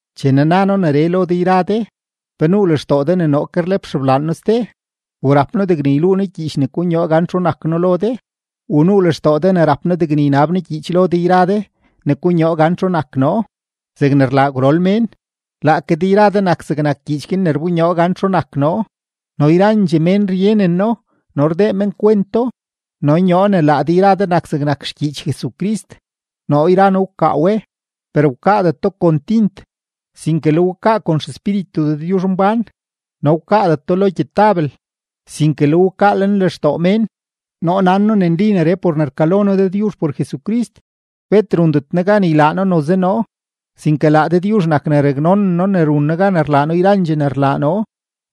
Chene na noo neree lo de yra de, ¿pe nuu lextoo de ne noo ke rlep xeblaan noo ste? ¿U rap noo degne yluu noo gyiich ne konyoo gan txu nak noo lo de? ¿U nuu lextoo de ne rap noo degne ynab noo gyiich lo de yra de ne konyoo gan txu nak noo zegne rlaa gwrol mén? Laake de yra de nak zegnak gyiich guin ne rbonyoo gan txu nak noo, no yrandxee mén ryeneno no rdee men kwento. No nyoo ne laa de yra de nak zegnak xgyiich Jesucrist; noo yra noo wkaa we, per wkaadeto kon tint, sinke le we wkaa por XEspíritu Dëdyuzhmbán, no wkaadeto lo gyetabel, sinke le we wkaa lenlextoo mén. Noo nan noo ne nli neree por ne rkalo noo Dëdyuzh por Jesucrist. Bet rundet noo gan ylaa noo noze noo; sinke laa Dëdyuzh nak ne raknonen noo ne run noo gan rlaa noo yrandxee ne rlaa noo.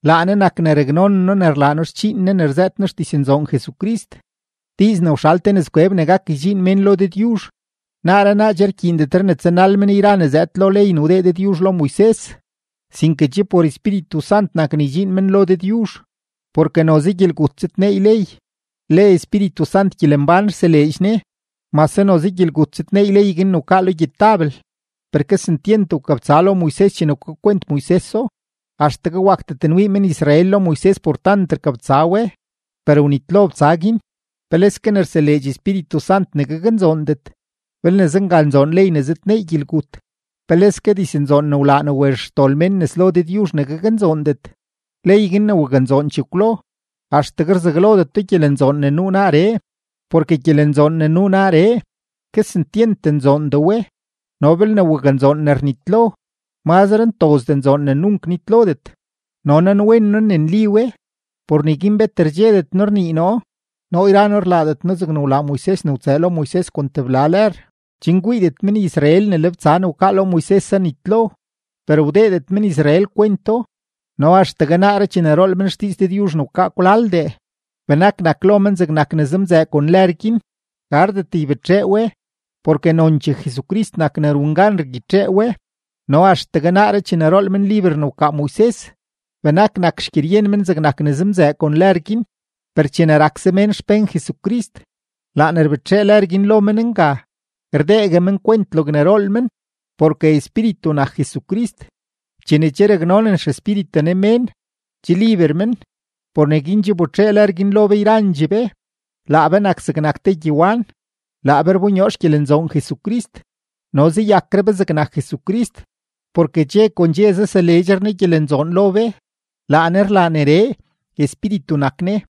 Laa Ne nak ne raknonen noo ne rlaa noo xdxiin Ne ne rzëët noo xdiznzoon Jesucrist, diiz ne wxal te nëzkweb ne gak ydxiin mén lo Dëdyuzh. Naaree naa che rkyiindetre ne tsanal men yra ne zëëd lo ley ne wdee Dëdyuzh lo Moises, sinke che por Espíritu Sant nak ne ydxiin men lo Dëdyuzh, porke noze gyelgut zëdneey ley, le Espíritu Sant gyelembán rseleedx Ne. Mase noze gyelgut zëdneey ley guin ne wkaa lo gyetabel, per kesentyent wkabtsa lo Moises chene wkakwent Moiseso, axtegue wakdet nwii men-Israel lo Moises por tant rkabtsa we, per wnitlo btsa guin, ¡peleske ne rseleedx Espíritu Sant ne gaknzoondet! Belne zenga nzoon ley ne zëdneey gyelgut, ¡peleske diznzoon ne wlaa ne wezh xdol mén nes lo Dëdyuzh ne gaknzoondet! Ley guin ne waknzoon chekwlo, axtegue rzaglodeto gyelenzoon ne nuu naaree, porke gyelenzoon ne nuu naaree, kesentyent nzoondee we. No belne waknzoon ne rnitlo, mazre ntozdee nzoon ne nunk nitlodet. No nanwen noo ne nli we; por neguin bet rdxedet noo rnii noo. Noo yra noo rlaadet noo zegne wlaa Moises ne wtsëë lo Moises kon tebla lër, chen kwiidet men-Israel ne le btsa ne wkaa lo Moises zanitlo. Per wdeedet men-Israel kwento, no axtegue naaree chene rool men xdiiz Dëdyuzh ne wkaa kwlaldee, benak nak lo men zegnak ne zemzëë kon lër guin; gardet ybetxee we, porke nonchee Jesucrist nak ne run gan rgyitxee we, no axtegue naaree chene rool men liber ne wkaa Moises, benak nak xgyeryen men zegnak ne zemzëë kon lër guin. Per chene rakse mén xpén Jesucrist, laa ne rbetxee lër guin lo men nga, rdeegue men kwent logne rool men. Porke Espíritu nak Jesucrist; chene che raknonen XEspíritu Ne mén, che liber men. Por neguin che wbetxee lër guin lo be yrandxee be, laa be nak zegnak te gyewan, laa be rbonyoo xgyelenzoon Jesucrist, no zayakre be zegnak Jesucrist, porke dxe kon dxe zaseleedxre Ne gyelenzoon lo be. Laa Ne rlaa neree; Espíritu nak Ne.